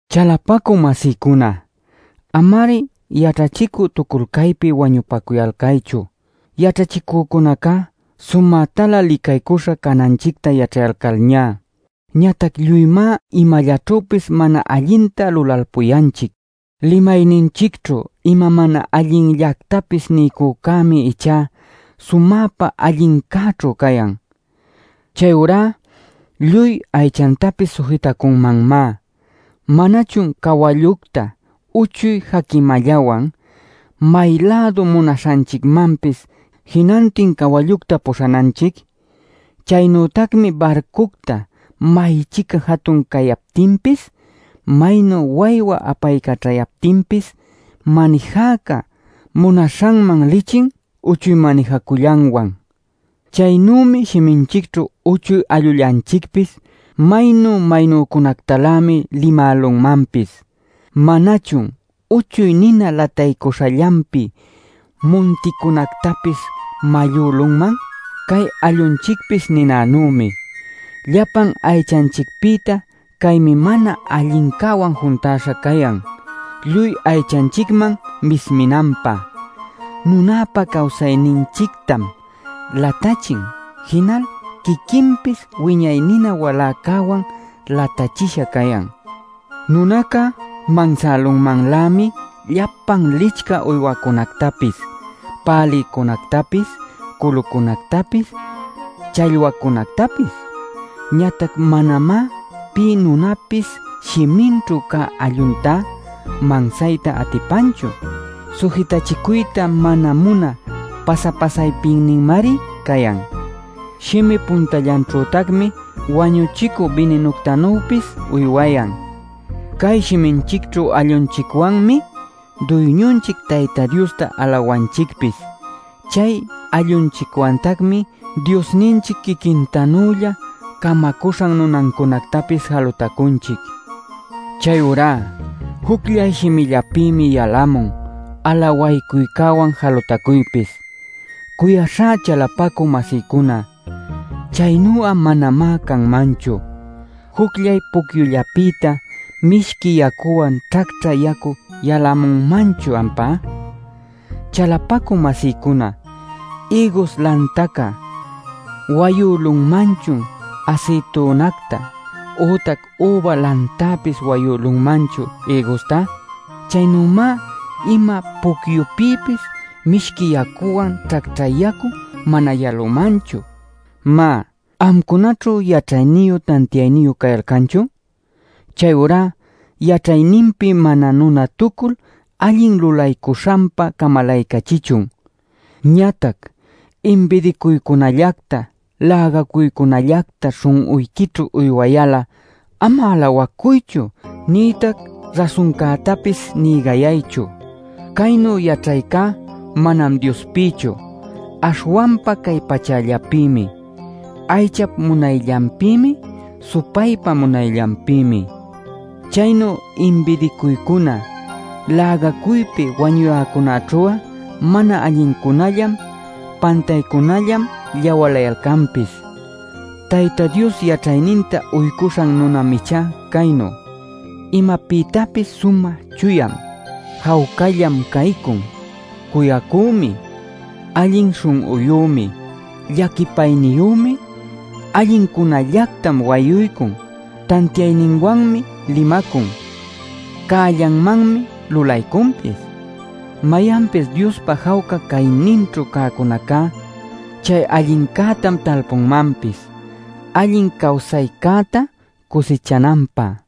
Chalapacü-masïcuna, ama-ari yaćhachicü-tuculcaypi wañupacuyalcaychu, yaćhachicücunaca sumätalä licaycuśha cananchicta yaćhayalcalñá. Ñatac lluymá imallaćhüpis mana allinta lulalpuyanchic. Limayninchicćhu ima mana allinllactapis niycücämi ichá sumäpa allincäćhu cayan. Chayurá lluy aychantapis sujitacunmanmá. ¿Manachun cawallucta uchuy jaquimallawan, may-lädu munaśhanchicmanpis jinantin cawallucta puśhananchic? Chaynütacmi barcucta may-chica jatun cayaptinpis, maynu waywa apaycaćhaptinpis manijäca munaśhanman lichin uchuy manijacullanwan. Chaynümi shiminchicćhu uchuy allullanchicpis; maynu-maynücunactalämi limälunmanpis. ¿Manachun uchuy nina lataycuśhallanpi munticunactapis mallülunman? Cay allunchicpis ninanümi; llapan aychanchicpïta caymi mana allincäwan juntäśha cayan, lluy aychanchicman misminanpä. Nunäpa cawsayninchictam latachin; jinal quiquinpis wiñay nina waläcäwan latächisha cayan. Nunaca mansälunmanlämi llapan licchä uywacunactapis, pälïcunactapis, culucunactapis, challwacunactapis. Ñatac manamá pï nunapis shiminćhu cä alluntá mansayta atipanchu. Sujitachicuyta mana munä pasa-pasaypinninmari cayan. Shimi puntallanćhütacmi wañuchicü bininuctanuypis uywayan. Cay shiminchicćhu allunchicwanmi Duyñunchic Tayta Diosta alawanchicpis, chay allunchicwantacmi Diosninchic quiquintanülla camacuśhan nunancunactapis jalutacunchic. Chayurá jucllay shimillapïmi yalamun alawaycuywan jalutacuypis. Cuyaśhá chalapacü-masïcuna, chaynu'a manamá canmanchu. ¿Jucllay pucyullapïta mishqui yacuwan ćhacćhä yacu yalämunmanchun ampá? Chalapacü-masïcuna ¿ïgus lantaca wayülunmanchun asïtunacta, ütac üba lantäpis wayülunmanchun ïgusta? Chaynümá ima pucyupïpis mishqui yacuwan ćhacćhä yacu mana yalunmanchu. Má, ¿amcunaćhu yaćhayniyu tantiayniyu cayalcanchun? Chayurá yaćhayninpi mana nunatucul allin lulaycuśhanpa camalaycachichun. Ñatac inbidinacuycunallacta lägacuycunallacta śhun'uyquićhu uywayal'a ama alawacuychu nïtac rasuncätapis nïgayaychu. Caynu “yaćhaycá” manam Diospïchu, aśhwanpa cay pachallapïmi, aychap munayllanpïmi, supaypa munayllanpïmi. Chaynu inbidinacuycuna, lägacuypi wañuyäcunaćhu'a mana allincunällam, pantaycunällam lläwalayalcanpis. Tayta Dios yaćhayninta uycuśhan nunam ichá caynu: imapïtapis sumä chuyam, jawcallam caycun, cuyacümi, allin śhun'uyümi, llaquipayniyümi, allincunällactam wayuycun, tantiayninwanmi limacun, cällanmanmi lulaycunpis. Mayanpis Diospa jawca cayninćhu cäcunacá, chay allincätam talpunmanpis, allin cawsaycäta cusichananpä.